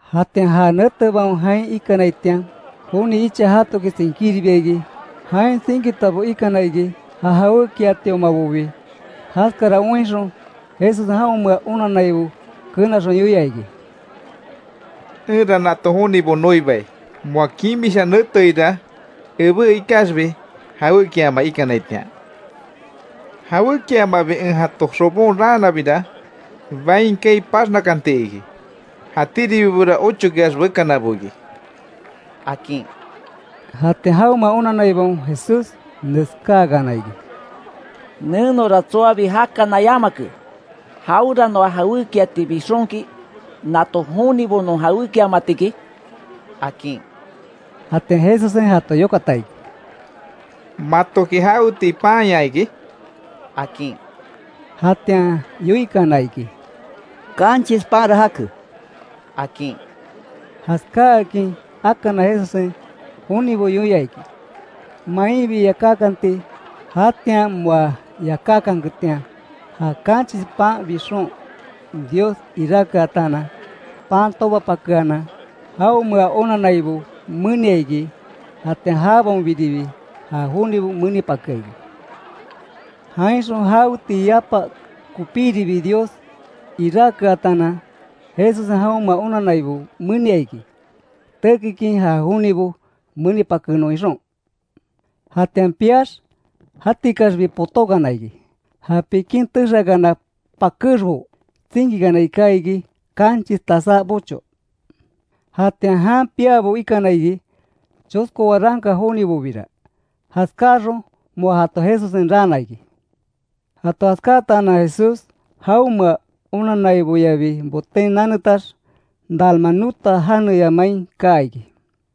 Jatian ja netebaon jain iikanaitian, joni icha jatoki tsinkíribia iki. Jain tsinkitabo ikana iki, ja jawékiatiomabobi. Jaskara oinxon, Jesussen jaonmea onannaibo kenaxon yoia iki: —Enra nato jonibo noibai. Moa kimisha neteira ebé ikaxbi, jawékiama ikanaitian. Jawékiamabi en jaton xobon raanabira, bain kaai paxnakanti iki. Jatíribibora ochokeax bekanabo iki —akin. Jatian jaonmea onanaibaon Jesús, neskáakana iki: —Nenora tsoabi jakana yamake, ¿Jaweranoa jawékiati bixonki, nato jonibo non jawékiamatiki? —akin. Jatian Jesussen jato yokata iki: —¿Matoki jaweti panya iki? —akin. Jatian yoikana iki: —Kanchis panra jake —akin. Jaskákin akana Jesussen, jonibo yoia iki, mainbi yakákanti. Jatian moa yakákanketian, ja kanchis pan bixon Dios iráke ataanan, pan tobapakeanan jaonmea onannaibo menia iki. Jatian jabaonbiribi, ja jonibo menipakea iki. Jainxon jawetii yapa kopíribi Dios iráke ataanan, Jesussen jaonmea onannaibo menia iki, tekikin ja jonibo menipakenon ixon. Jatian piax, jatikaxbi potókana iki. Ja pikin texeakana pakexbo tsinkikana iká iki, kanchis tasá bocho. Jatian jan piábo ikana iki, chosko waranka jonibobira. Jaskáxon, moa jato Jesussen raana iki. Jato jaskáatanan Jesús, jaonmea onanaiboyabi boten nanetax, Dalmanuta janeya main kaa iki.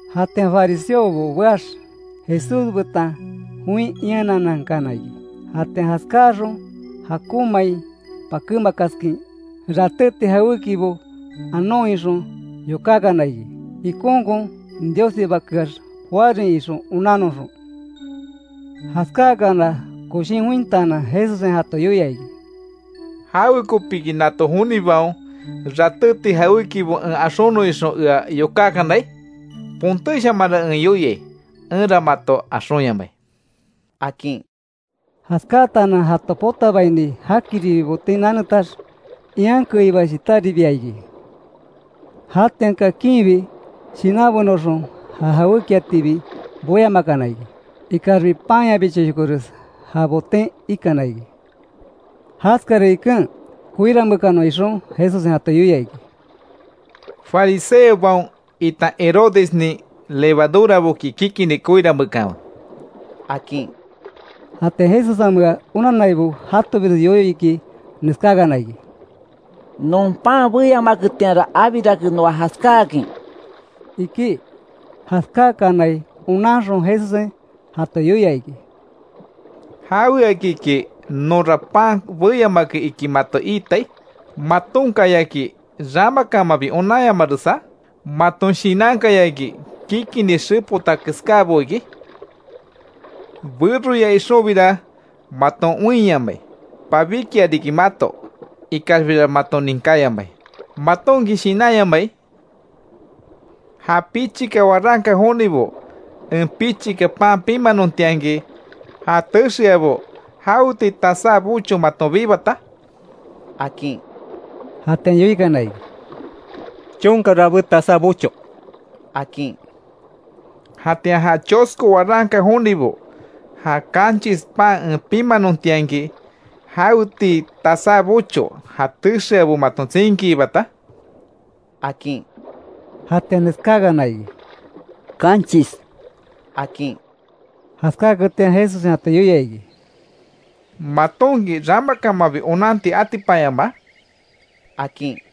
Jatian fariseobo beax, Jesús betan join iananankana iki. Jatian jaskáaxon jakonmain pakémakaskin, ratéti jawékibo anon ixon yokákana iki. Ikonkon Diossibakeax joárin ixon onannoxon. Jaskáakana, koshin jointaanan Jesussen, jato yoia iki: —¿Jawekopiki nato jonibaon, ratéti jawékibo en axonon ixon ea yokákanai? Pontéshamanra en yoiai, enra mato axonyamai —akin. Jaskáatanan jato potabaini, jakiribi boten nanetax, ian keiba shitáribia iki. Jatian kakinbi, shinanbenoxon ja jawékiatibi boyamakana iki. Ikaxbi panyabichoshokores ja boten ikana iki. Jaskara iken, koirameekanon ixon Jesussen jato yoia iki: —Fariseobaon, itan Herodesnin levaduraboki kikinni koirameekanwe —akin. Jatian Jesussenmea onannaibo jatobires yoyo iki, neskákana iki: —Non pan beyamaketianra abirake noa jaskáakin —iki. Jaskákanai onanxon Jesussen jato yoia iki: —¿Jaweakiki, nonra pan beyamake iki mato iitai? ¿Matonkayaki ramakamanbi onanyamaresa? ¿Maton shinankayaki kikinni xepota keskábo iki? Beroya ixonbira, maton oinyamai, pabíkia riki mato, ikaxbira maton ninkáyamai ¿Matonki shinanyamai? Ja pichika waranka jonibo, en pichika pan pimanontianki, ja texeabo ¿Jaweti tasá bocho maton bibata? —akin. Jatian yoikana iki: —Chonka rabé tasá bocho —akin. Jatian ja chosko waranka jonibo, ja kanchis pan en pimanontianki, ¿Jawetii tasá bocho ja texeabo maton tsinkiibata? akin. Jatian neskáakana iki: —Kanchis —akin. Jaskáketian Jesussen jato yoia iki: —¿Matonki ramakamanbi onanti atipanyamaa? —akin.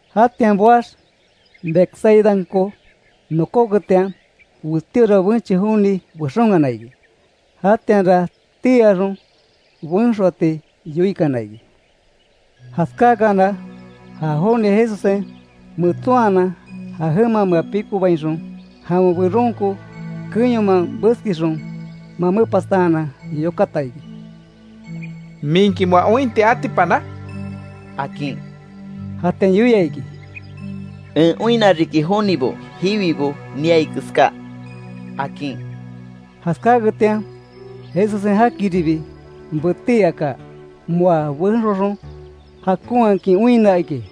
Jatian boax, Betsaidanko nokóketian, westíora benche joni bexonkana iki. Jatianra tii axon, benxoati yoikana iki. Jaskákana, ja joni Jesussen metsonhanan, ja jemamea pikobainxon, jawen beronko keyoman beskixon, mamepastaanan yokata iki: —¿Minki moa ointi atipana? —akin. Jatian yoia iki: —En oinna riki jonibo, jiwibo niai keská —akin. Jaskáketian, Jesussen jakiribi betí aka, moa benxoxon jakonhakin oinna iki.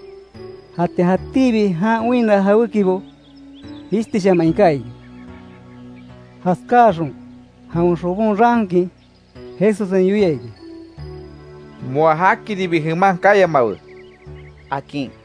Jatian jatíbi jan oinna jawékibo jishtishaman iká iki. Jaskáaxon, jawen xobon raankin, Jesussen yoia iki: —Moa jakiribi jeman kayamawe —akin.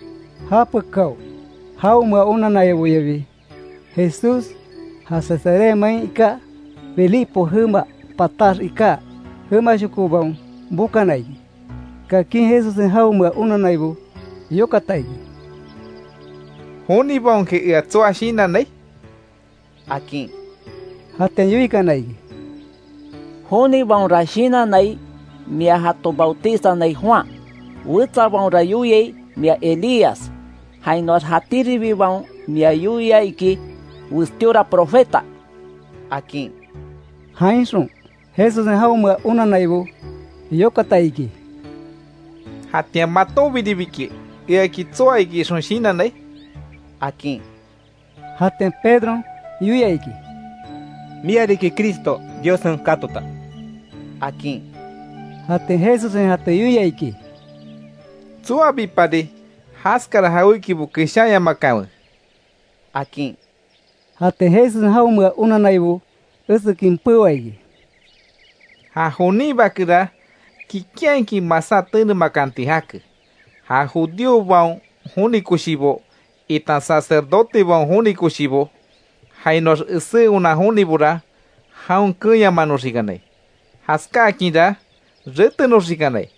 Japekáo, jaonmea onanaiboyabi Jesús, ja Cesarea main iká, Filipo jema patax iká jemashokobaon bokana iki. Kakin Jesussen jaonmea onannaibo yokata iki: —¿Jonibaonki ea tsoa shinannai? —akin. Jatian yoikana iki: —Jonibaonra shinannai mia jato bautizanai Juan. Wetsabaonra yoiai mia Elías. Jainoax jatíribibaon mia yoiai iki, westíora profeta —akin. Jainxon, Jesussen jaonmea onannaibo yokata iki: —Jatian ¿Matonbiribiki, eaki tsoa ixon shinannai? —akin. Jatian Pedron yoia iki: —Mia riki Cristo, Diossen katota —akin. Jatian Jesussen jato yoia iki: —Tsoabipari jaskara jawékibo keshanyamakanwe —akin. Jatian Jesussen jaonmea onannaibo esekin peoa iki: —Ja jonin Bakera, kikinhakin masá tenemakanti jake. Ja judíobaon joni koshibo, itan sacerdotebaon koshibo, jainoax esé onan jonibora, jaon keenyamanoxikanai. Jaskákinra retenoxikanai,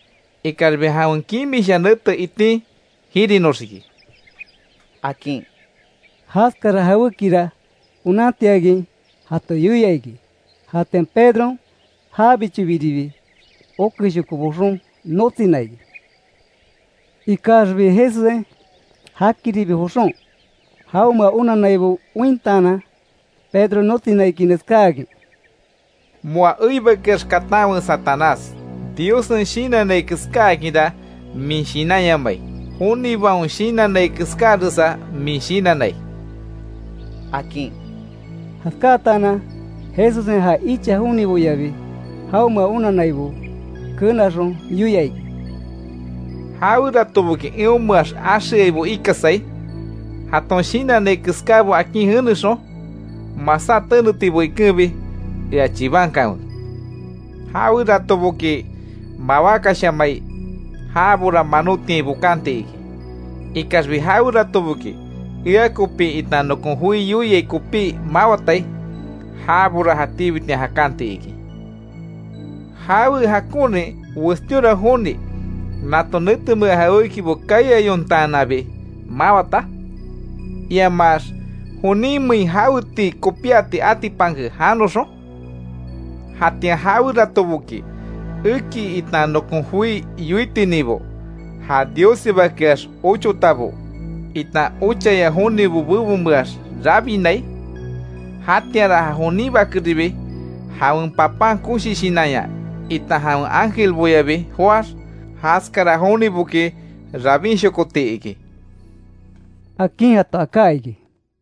ikaxbi jawen kimisha nete itin jirinoxiki —akin. Jaskara jawékira onantiakin jato yoia iki. Jatian Pedron jabichobiribi okeshoko boxon notsina iki. Ikaxbi Jesussen jakiribi joxon, jaonmea onannaibo ointaanan, Pedro notsina iki neskáakin: —Moa eibakeax, katanwe Satanás. Diossen shinannai keskákinra min shinanyamai. Jonibaon shinannai keskáresa min shinannai —akin. Jaskáatanan Jesussen, ja icha joniboyabi, jaonmea onannaibo kenaxon, yoia iki: —Jaweratoboki, eonmeax axeaibo ikasai, jaton shinannai keskábo akin jenexon, masá tenetibo ikenbi, ea chibankanwe. Jaweratoboki, mawákashamai, jabora manotiain bokanti iki. Ikaxbi jaweratoboki, ea kopi itan nokon joi yoiai kopí mawatai, jabora jatíbitian jakanti iki. ¿Jawe jakonrin westíora joni nato netemea jawékibo kaiayontaananbi mawata? Iamax ¿Joninmein jawetii kopíati atipanke janoxon? Jatian jaweratoboki, eki itan nokon joi yoitininbo, ja Diossibakeax ochotabo, itan ochaya jonibo bebonmeax rabinai, jatíanra ja jonin Bakeribi, jawen Papan koshi shinanya, itan jawen ángelboyabi joáx, jaskara joniboki rabinshokoti iki —akin jato aká iki.